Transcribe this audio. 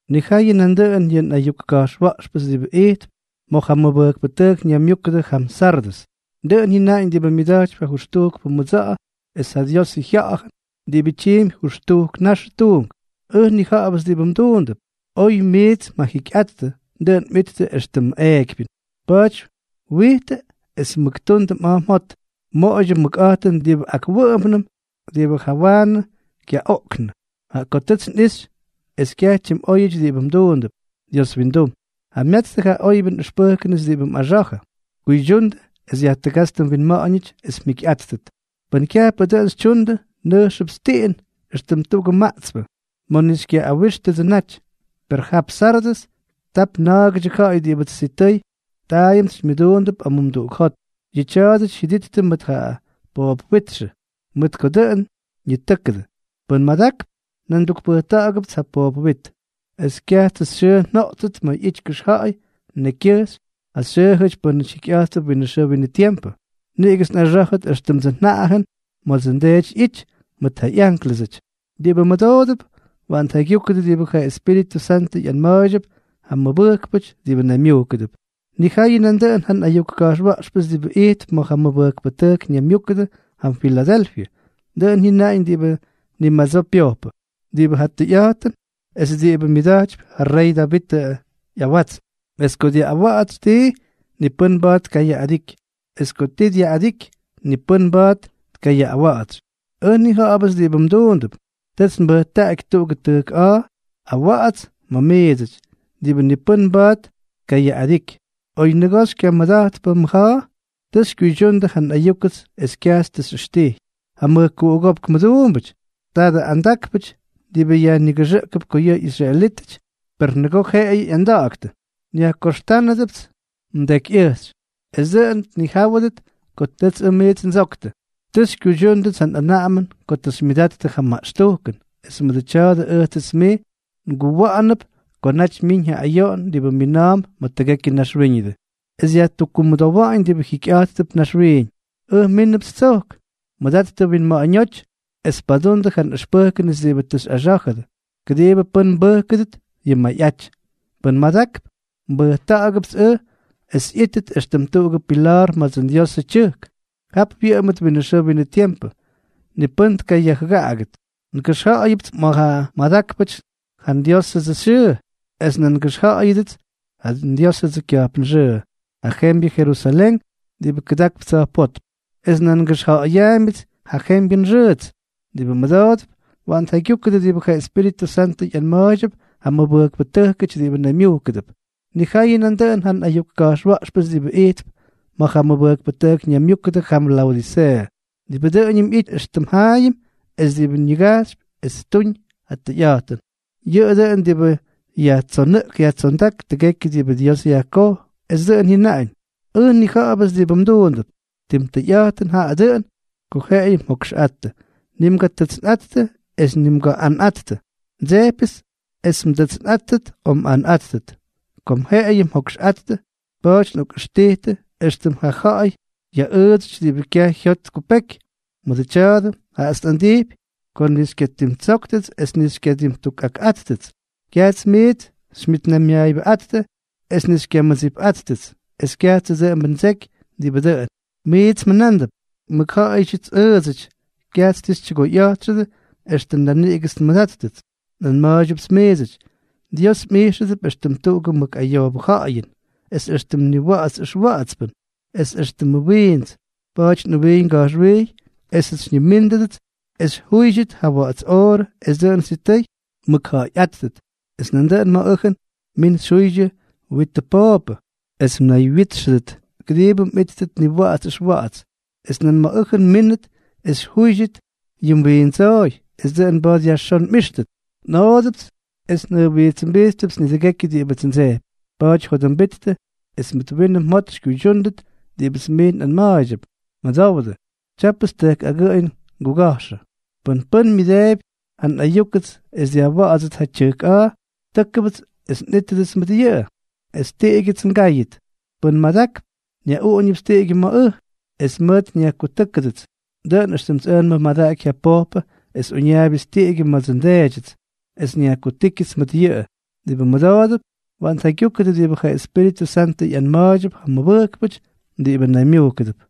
’Nijayʉ nandʉꞌʉn yʉ nꞌayuk ka̱jxwa̱ꞌxpʉts diꞌibʉ ijtp ma̱ ja mʉbʉjkpʉtʉjk ñaymyúkʉdʉ jam Sardʉs: “Dʉꞌʉn jyʉnaꞌañ diꞌibʉ myʉda̱jtypy ja jʉxtujkʉ mʉdsa̱ꞌa̱ es ja Diosʉ Jya̱ꞌa̱jʉn diꞌibʉ tyiimpy jʉxtujk naxʉ tuunk: Ʉj nnija̱ꞌa̱bʉts diꞌibʉ mduundʉp. Oy miits mjajikyꞌattʉ, dʉꞌʉn mꞌittʉ éxtʉm eekypyʉn. Pa̱a̱ty wijtʉ es mʉk tundʉ ja mjot, moꞌoydyʉ mʉkꞌa̱jtʉn diꞌibʉ akwʉꞌʉmpnʉm, diꞌibʉ jawaanʉ kyaꞌoꞌknʉ, jaꞌa ko tʉts nꞌixy es kyaj tyimꞌóyʉty diꞌibʉ mduundʉp Dios windum. Jamyatstʉ ja oybyʉ nꞌʉxpʉjkʉnʉts diꞌibʉ mꞌaxa̱jʉ. Kuydyundʉ es yajtʉgátstʉ mwinma̱ꞌa̱ñʉty es mjikyꞌáttʉt. Pʉn kyajpʉ dʉꞌʉn xytyundʉ, nʉjxʉpts tiꞌin, éxtʉm tuꞌugʉ maꞌtspʉ, ma̱ ni xykyaꞌꞌawíxyʉdsʉ naty. Per jap Sardʉs tap na̱a̱gʉdyʉ ja̱ꞌa̱y diꞌibʉts sitʉy taayʉmts xymyʉduundʉp amumduꞌuk jot. Yʉꞌʉ tya̱a̱dʉty jyʉdíttʉt mʉt ʉj poop witxʉ, mʉt ko dʉꞌʉn ñitʉ́kʉdʉ. Pʉ́n madakp, nan ndukpʉjta̱ꞌa̱gʉpts ja poop wit, es kyajtsʉ xyʉʉ njoꞌtsʉt ma̱ ꞌyity kʉxja̱ꞌa̱y nekykyʉjxy ja xyʉʉjʉty pʉ́nʉty jikyꞌa̱jttʉp winʉ xʉʉ winʉ tiempʉ. Niꞌigʉts nꞌaxá̱jʉt éxtʉmdsʉ njaꞌajʉn ma̱dsʉ nDeety ꞌyity mʉt ja ꞌyánklʉsʉty. Diꞌibʉ mʉdoodʉp, waꞌan tjaygyúkʉdʉ diꞌibʉ ja Espíritʉ Santʉ ꞌyanma̱a̱ydyʉp ja mʉbʉjkpʉty diꞌibʉ naymyujkʉdʉp.” ’Nijayʉ nandʉꞌʉn ja nꞌayuk ka̱jxwa̱ꞌxpʉts diꞌibʉ ijtp ma̱ ja mʉbʉjkpʉtʉjk ñaymyúkʉdʉ jam Filadelfyʉ: “Dʉꞌʉn jyʉnaꞌañ diꞌibʉ ni madsoo pyojpʉ, diꞌibʉ ja Tʉyꞌa̱jtʉn es diꞌibʉ myʉda̱jtypy ja rey Davitʉ ꞌyawatsn; es ko dyaꞌꞌawa̱ꞌa̱tsy tii, ni pʉ́n mba̱a̱t tkayaꞌꞌadiky; es ko ti dyaꞌꞌadiky, ni pʉ́n mba̱a̱t tkayaꞌꞌawa̱ꞌa̱tsy. Ʉj nnija̱ꞌa̱bʉts diꞌibʉ mduundʉp. Tʉts mbʉjtaꞌaky tuꞌugʉ tʉjk a̱a̱ awa̱ꞌa̱ts ma̱ miidsʉty, diꞌibʉ ni pʉ́n mba̱a̱t tkayaꞌꞌadiky. Oy nʉgoo xykyamʉda̱jtpʉ mʉja̱a̱, tʉ xykyuydyundʉ ja nꞌayúkʉts es kyajts tʉ xyꞌʉxtijy. Ja mʉjkuꞌugópk mʉduumbʉty, tadʉ andákpʉty diꞌibʉ nayñiga̱jxʉdʉp ko yʉꞌʉ ꞌyisraelítʉty, per nʉgoo jeꞌeyʉ ꞌyanda̱ꞌa̱ktʉ, nyajkoxtánʉdʉpts mdekyꞌʉjxy, es dʉꞌʉn tnijáwʉdʉt ko tʉts ʉj miits ndsoktʉ. Tʉ xykyuydyúndʉts ja nꞌanaꞌamʉn ko tʉ xymyʉdattʉ ja maꞌxtujkʉn, es mʉdʉ tya̱a̱dʉ ʉjtsʉts mij nguwa̱ꞌa̱nʉp ko naty myiñ ja ayoꞌon diꞌibʉ mina̱a̱mp ma̱ tʉgekyʉ naxwíñʉdʉ, es yajtukkumʉdowa̱ꞌa̱ñ diꞌibʉ jikyꞌa̱jttʉp naxwiiñ. Ʉj mínʉpts tsojk. Mʉdattʉ mwinma̱ꞌa̱ñóty es padundʉ ja nꞌʉxpʉjkʉnʉts diꞌibʉ tʉ xyꞌaxá̱jʉdʉ, kʉdiibʉ pʉ́n mbʉjkʉdʉt yʉ mmayꞌaty. Pʉ́n madakp, nbʉjta̱ꞌa̱gʉpts ʉj es ꞌyítʉt éxtʉm tuꞌugʉ pila̱a̱r ma̱dsʉ nDiosʉ tyʉjk. Jap wyʉꞌʉmʉt winʉ xʉʉ winʉ tiempʉ. Ni pʉ́n tkayajjʉgaꞌagʉt. Ngʉxja̱ꞌa̱yʉpʉts ma̱ ja madákpʉty ja nDiósʉdsʉ xyʉʉ. Es nan ngʉxja̱ꞌa̱yʉdʉts ja nDiósʉdsʉ kya̱jpn xʉʉ, ja jembyʉ Jerusalén diꞌibʉ kʉdakp tsa̱jpótm. Es nan ngʉxja̱ꞌa̱yaambyʉts yʉ jembyʉ nxʉʉts. Diꞌibʉ mʉdoodʉp, waꞌan tjaygyúkʉdʉ diꞌibʉ ja Espíritʉ Santʉ ꞌyanma̱a̱ydyʉp ja mʉbʉjkpʉty diꞌibʉ naymyujkʉdʉp.” ’Nijayʉ nandʉꞌʉn ja nꞌayuk ka̱jxwa̱ꞌxpʉts diꞌibʉ ijtp ma̱ ja mʉbʉjkpʉtʉjk ñaymyúkʉdʉ jam Laodiseeʉ: “Diꞌibʉ dʉꞌʉñʉm ꞌyity éxtʉm jaayʉm es diꞌibʉ ñigajxypy es ttuñ ja tʉyꞌa̱jtʉn, yʉꞌʉ dʉꞌʉn diꞌibʉ yajtsonʉꞌk yajtsondák tʉgekyʉ diꞌibʉ Dios yajkoj, es dʉꞌʉn jyʉnaꞌañ: Ʉj nnija̱ꞌa̱bʉts diꞌibʉ mduundʉp. Tim tʉyꞌa̱jtʉn jaꞌa dʉꞌʉn ko jeꞌeyʉ mjokxꞌattʉ. Ni mgatʉtsnꞌattʉ es ni mgaꞌꞌanꞌattʉ. Ndsejpyʉts es mdʉtsnꞌáttʉt o mꞌanꞌáttʉt. Kom jeꞌeyʉ mjokxꞌattʉ, pa̱a̱ty nꞌokꞌʉxtijtʉ éxtʉm ja ja̱ꞌa̱y yaꞌʉʉdsʉty diꞌibʉ kyaj jyot tkupeky. Mʉdʉ tya̱a̱dʉ, jaꞌats nꞌandijpy ko ni xykyadimtsóktʉts es ni xykyadimtukꞌakꞌáttʉts. Kyajts miits xymyʉtnaymyaayʉbʉꞌáttʉ es ni xykyamʉdsipꞌáttʉts, es kyajtsʉ dʉꞌʉmbʉ ndseky diꞌibʉ dʉꞌʉn. Miits mjʉnándʉp: Mʉkja̱ꞌa̱yʉdyʉts ʉʉdsʉty, kyajts ti xytyʉgoyꞌa̱jtxʉdʉ, extʉ naniꞌigʉts nmʉdáttʉts. Nꞌanma̱a̱ydyʉpts miidsʉty: Dios mꞌijxʉdʉp éxtʉm tuꞌugʉ mʉk ayoobʉ ja̱ꞌa̱yʉn, es éxtʉmʉ niwa̱ꞌa̱ts ʉxwa̱ꞌa̱tspʉn, es éxtʉmʉ wiints. Pa̱a̱ty nꞌʉwijy nga̱jxwijy esʉts xyñimíndʉdʉts es xyjúydyʉt ja wa̱ꞌa̱ts oorʉ, es dʉꞌʉn sitʉy mmʉkja̱ꞌa̱yꞌáttʉt. Es nandʉꞌʉn ma̱ ʉjʉn min xyjuydyʉ mwitʉ pooppʉ, es mnaywyítxʉdʉt, kʉdiibʉ mꞌíttʉt niwa̱ꞌa̱ts ʉxwa̱ꞌa̱ts. Es nan ma̱ ʉjʉn mmínʉt es xyjúydyʉt yʉ mwiindsooy, es dʉꞌʉn mba̱a̱t yajxón mꞌíxtʉt. Nꞌoodʉpts es njʉjwijtsʉmbijttʉpts nidʉgekyʉ diꞌibʉts ndsejpy. Pa̱a̱ty jodʉmbittʉ es mʉt winʉ mjot xykyuydyúndʉt diꞌibʉts miits nꞌanma̱a̱ydyʉp. Mʉdowdʉ, tyápʉts tʉjk agʉꞌʉy nguga̱jxʉ. Pʉn pʉ́n myʉdeebyʉts ja nꞌayuk es dyaꞌꞌawa̱ꞌa̱dsʉt ja tyʉjk a̱a̱, tʉ́kʉbʉts es nꞌítʉdʉts mʉt yʉꞌʉ, es tiꞌigyʉts ngáyʉt. Pʉ́n madakp, nyaꞌuꞌuñʉpts tiꞌigyʉ ma̱ ʉj, es mʉʉt nyajkutúkʉdʉts, dʉꞌʉn éxtʉmts ʉj nmʉmadaky ja pojpʉ es uñaaybyʉts tiꞌigyʉ ma̱dsʉ nDeedyʉts, es nyajkutíkyʉts mʉt yʉꞌʉ. Diꞌibʉ mʉdoodʉp, waꞌan tjaygyúkʉdʉ diꞌibʉ ja Espíritʉ Santʉ ꞌyanma̱a̱ydyʉp ja mʉbʉjkpʉty diꞌibʉ naymyujkʉdʉp.”